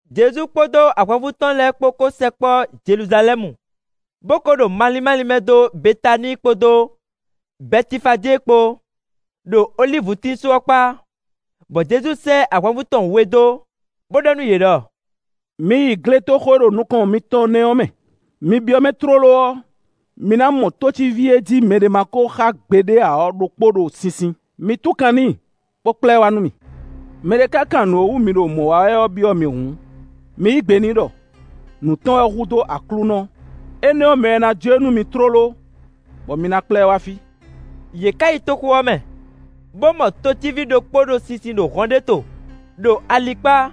Jezu kpódó ahwanvú tɔn lɛ́ɛ kpó ko sɛkpɔ́ Jeluzalɛ́mu, bó ko ɖo malín málín mɛ dó Betaníi kpódó Bɛtifajée kpó, ɖo olívutín só ɔ́ kpá; bɔ Jezu sɛ́ ahwanvú tɔn we dó, bó ɖɔ nú yě ɖɔ: “Mi yi gletoxo e ɖo nukɔn mitɔn nɛ́ ɔ́ mɛ. Mi byɔ́ mɛ tlóló ɔ́, mi ná mɔ tócíví e jí mɛɖé ma ko xá gbeɖé ǎ ɔ́ ɖokpó ɖo sinsin; mi tún kan n'i, bó kplá ɛ wá nú mì. Mɛ ɖé ka kan nǔ e wú mi ɖo mɔ̌ wa wɛ ɔ́ byɔ́ mi hǔn, mi yí gbe n'i ɖɔ: ‘Nǔ tɔn wɛ hú dó Aklúnɔ;’ énɛ́ ɔ́, mɛ ɔ́ ná jó e nú mi tlóló, bɔ mi ná kplá ɛ wá fí.” Yě ka yi toxo ɔ́ mɛ, bó mɔ tócíví ɖokpó ɖo sinsin ɖo hɔn ɖé to, ɖo ali kpá,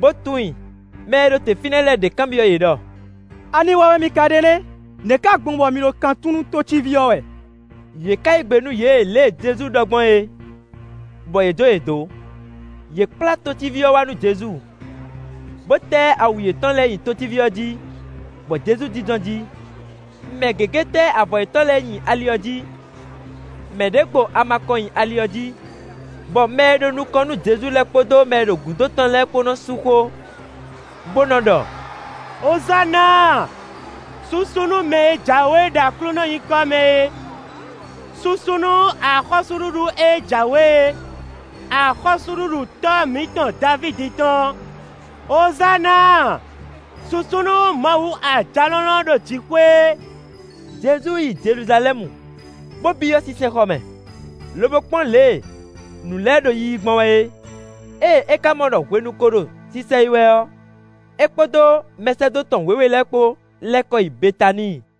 bó tún i. Mɛ e ɖo te fínɛ́ lɛ́ɛ ɖě kanbyɔ́ yě ɖɔ: “Ani wa wɛ mi ka ɖe nɛ́? Nɛ̌ ka gbɔn bɔ mi ɖo kan tún nú tócíví ɔ́ wɛ?” Yě ka yí gbe nú yě lě e Jezu ɖɔ gbɔn é, bɔ yě jó yě dó. Yě kplá tócíví ɔ́ wá nú Jezu, bó tɛ́ awu yětɔn lɛ́ɛ nyi tócíví ɔ́ jí, bɔ Jezu jínjɔ́n jí. Mɛ gěgé tɛ́ avɔ yětɔn lɛ́ɛ nyi ali ɔ́ jí, mɛ ɖě gbo ama kɔn nyi ali ɔ́ jí. Bɔ mɛ e ɖo nukɔn nú Jezu lɛ́ɛ kpódó mɛ e ɖo gǔdo tɔn lɛ́ɛ kpó nɔ́ sú xó, bó nɔ́ ɖɔ: “Ozána! Susu nú mɛ e jǎwe ɖo Aklúnɔ nyǐkɔ mɛ é. Susu nú axɔ́súɖuɖu e jǎwe é; axɔ́súɖuɖu tɔ́ mǐtɔn Davídi tɔn. Ozána! Susu nú Mawu Ajalɔ̌nlɔn ɖo jǐxwé.” Jezu yi Jeluzalɛ́mu, bó byɔ́ sinsɛnxɔ mɛ, lobo kpɔ́n lě e nǔ lɛ́ɛ ɖo yiyi gbɔn wɛ é. Ée é ka mɔ ɖɔ hwenu ko ɖo sisɛyi wɛ ɔ́, é kpódó mɛsɛ́dó tɔn wěwe lɛ́ɛ kpó lɛ́ kɔ yi Betaníi.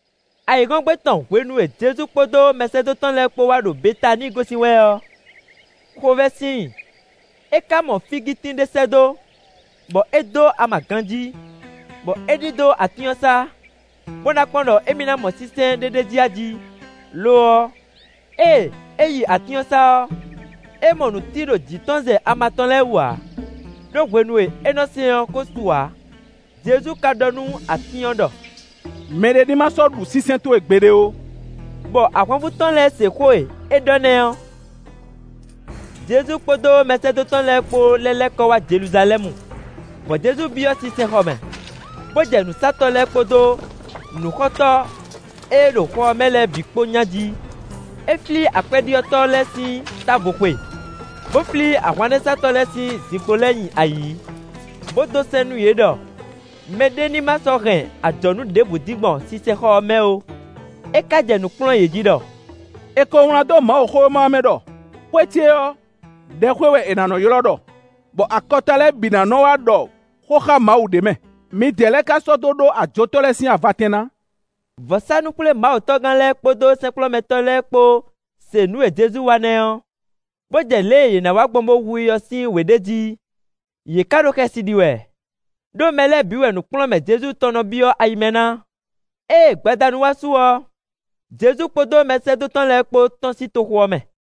Ayǐhɔ́ngbe tɔn hwenu e Jezu kpódó mɛsɛ́dó tɔn lɛ́ɛ kpó wá ɖo Betaníi gosín wɛ ɔ́, xovɛ́ sin i. É ka mɔ fígitín ɖé sɛ́ dó, bɔ é dó ama ganjí, bɔ é ɖidó atín ɔ́ sá, bó ná kpɔ́n ɖɔ émí ná mɔ sínsɛ́n ɖé ɖ'é jí a jí; lo ɔ́, ée é yi atín ɔ́ sá ɔ́, é mɔ nǔtí ɖo jǐ tɔn zɛ ama tɔn lɛ́ɛ wú ǎ, ɖó hwenu e é nɔ́ sɛ́n ɔ́ ko su ǎ. Jezu ka ɖɔ nú atín ɔ́ ɖɔ: “Mɛ ɖé ní ma sɔ́ ɖu sínsɛ́n towe gbeɖé ó,” bɔ ahwanvú tɔn lɛ́ɛ se xó e é ɖɔ nɛ́ ɔ́. Jezu kpódó mɛsɛ́dó tɔn lɛ́ɛ kpó lɛ́ lɛ́ kɔ wá Jeluzalɛ́mu, bɔ Jezu byɔ́ sinsɛnxɔ mɛ, bó jɛ nǔsatɔ́ lɛ́ɛ kpódó nǔxɔtɔ́ e ɖo xɔ ɔ́ mɛ lɛ́ɛ bǐ kpó nya jí; é flí akwɛ́ɖyɔ́tɔ́ lɛ́ɛ sín távo xwe, bó flí ahwannɛ́satɔ́ lɛ́ɛ sín zinkpo lɛ́ɛ nyi ayǐ, bó dó sɛ́n nú yě ɖɔ mɛɖé ní ma sɔ́ hɛn ajɔ̌nú ɖěbǔ dín gbɔn sinsɛnxɔ ɔ́ mɛ ó. É ka jɛ nǔ kplɔ́n yě jí ɖɔ: “È ko wlán dó Mawuxówéma ɔ́ mɛ ɖɔ: ‘Xwé ce ɔ́, ɖɛxwé wɛ è nǎ nɔ́ ylɔ́ ɖɔ, bɔ akɔta lɛ́ɛ bǐ ná nɔ́ wá ɖɔ xó xá Mawu ɖ'é mɛ.’ Midɛɛ lɛ́ɛ ka sɔ́ dó ɖó ajotɔ́ lɛ́ɛ sín avatɛn ná.” Vɔ̌sánú-xwlémawutɔ́gán lɛ́ɛ kpódó sɛ́nkplɔ́nmɛtɔ́ lɛ́ɛ kpó se nǔ e Jezu wa nɛ́ ɔ́, bó jɛ lě e yě ná wa gbɔn bó hu i ɔ́ sín wě ɖe jí, yě ka ɖo xɛsi ɖi wɛ, ɖó mɛ lɛ́ɛ bǐ wɛ nǔkplɔ́nmɛ Jezu tɔn nɔ byɔ́ ayi mɛ ná. Ée gbadanu wá su ɔ́, Jezu kpódó mɛsɛ́dó tɔn lɛ́ɛ kpó tɔ́n sín toxo ɔ́ mɛ.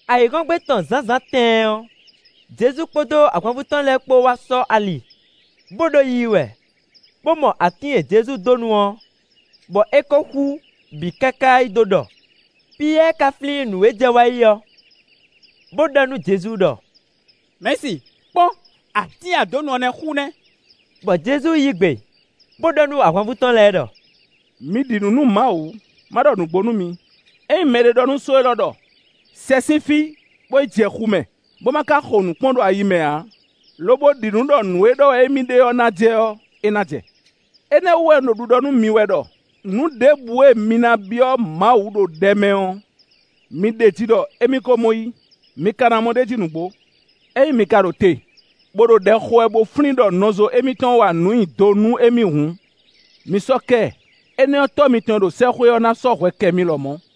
Ayǐhɔ́ngbe tɔn zǎnzǎn tɛɛn ɔ́, Jezu kpódó ahwanvú tɔn lɛ́ɛ kpó wá sɔ́ ali, bó ɖo yiyi wɛ, bó mɔ atín e Jezu dó nu ɔ́, bɔ é ko xú bǐ káká yí dó ɖɔ. Piyɛ́ɛ ka flín nǔ e jɛ wá yi ɔ́, bó ɖɔ nú Jezu ɖɔ: “Mɛ̌si, kpɔ́n atín e a dó nu ɔ́ nɛ́ xú nɛ́!” Bɔ Jezu yí gbe, bó ɖɔ nú ahwanvú tɔn lɛ́ɛ ɖɔ: “Mi ɖi nǔ nú Mawu; má ɖɔ nǔgbó nú mi, ényí mɛɖé ɖɔ nú só élɔ́ ɖɔ: ‘Sɛ sín fí, bo yi jɛ xu mɛ,’ bó ma ká xo nǔ kpɔ́n ɖo ayi mɛ ǎ, lobo ɖi ɖɔ nǔ e ɖɔ wɛ émí ɖe ɔ́ ná jɛ ɔ́, é ná jɛ. Énɛ́ ɔ́ wú wɛ un ɖo ɖiɖɔ nú mi wɛ ɖɔ: Nǔ ɖěbǔ e mi ná byɔ́ Mawu ɖo ɖɛ mɛ ɔ́, mi ɖeji ɖɔ émí ko mɔ yí; mi ka ná mɔ ɖ'é jí nǔgbó. Ényí mi ka ɖo te, bó ɖo ɖɛ xo wɛ bó flín ɖɔ nɔzo émítɔn wa nǔ nyi do nú émí hǔn, mi sɔ́ kɛ ɛ; énɛ́ ɔ́, Tɔ́ mitɔn e ɖo sɛ́xwé ɔ́ ná sɔ́ hwɛ kɛ mi lɔmɔ̌. [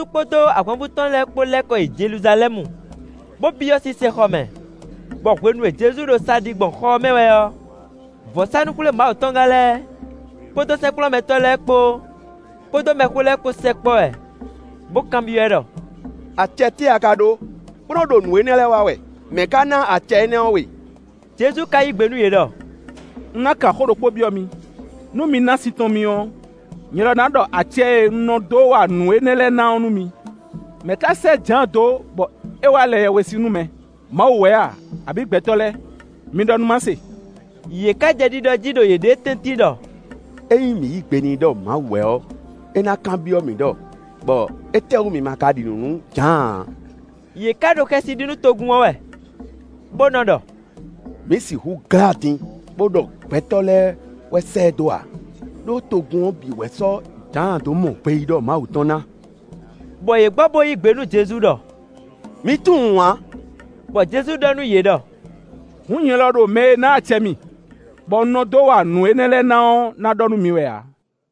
Jezu kpódó ahwanvú tɔn lɛ́ɛ kpó lɛ́ kɔ yi Jeluzalɛ́mu, bó byɔ́ sinsɛnxɔ mɛ, bɔ hwenu e Jezu ɖo sa ɖi gbɔn xɔ ɔ́ mɛ wɛ ɔ́, vɔ̌sánú-xwlémawutɔ́gán lɛ́ɛ, kpódó sɛ́nkplɔ́nmɛtɔ́ lɛ́ɛ kpó, kpódó mɛxó lɛ́ɛ kpó sɛkpɔ́ ɛ, bó kanbyɔ́ ɛ ɖɔ: “Acɛ tɛ́ wɛ a ka ɖó, bó nɔ́ ɖo nǔ énɛ́ lɛ́ɛ wa wɛ? Mɛ̌ ká ná acɛ énɛ́ ɔ́ we?” Jezu ka yí gbe nú yě ɖɔ: “Un ná kan xó ɖokpó byɔ́ mi, nú mi ná sin tɔn mì ɔ́, nyɛ lɔ ná ɖɔ acɛ e un nɔ dó wa nǔ énɛ́ lɛ́ɛ ná ɔ́ nú mi. Mɛ̌ ká sɛ́ Jǎan dó bɔ é wá lɛ yɛhwesin nú mɛ? Mawu wɛ a, abǐ gbɛtɔ́ lɛ́ɛ? Mi ɖɔ nú má se.” Yě ka jɛ ɖiɖɔ jí ɖo yěɖée tɛ́ntin ɖɔ: “Ényí mǐ yí gbe n'i ɖɔ Mawu wɛ ɔ́, é ná kanbyɔ́ mǐ ɖɔ: ‘Bɔ étɛ́wú mi ma ka ɖi nǔ nú Jǎan ǎ?’” Yě ka ɖo xɛsi ɖi nú togun ɔ́ wɛ, bó nɔ́ ɖɔ: “Mǐ sixú glá din bó ɖɔ gbɛtɔ́ lɛ́ɛ wɛ sɛ́ ɛ dó ǎ, ɖó togun ɔ́ bǐ wɛ sɔ́ Jǎan dó mɔ gbeyíɖɔ Mawu tɔn ná.” Bɔ yě gbɔ bo yí gbe nú Jezu ɖɔ: “Mǐ tunwun ǎ.” Bɔ Jezu ɖɔ nú yě ɖɔ: “Hǔn nyɛ lɔ ɖo mɛ e ná acɛ mì, bɔ un nɔ dó wa nǔ énɛ́ lɛ́ɛ ná ɔ́ ná ɖɔ nú mi wɛ ǎ.”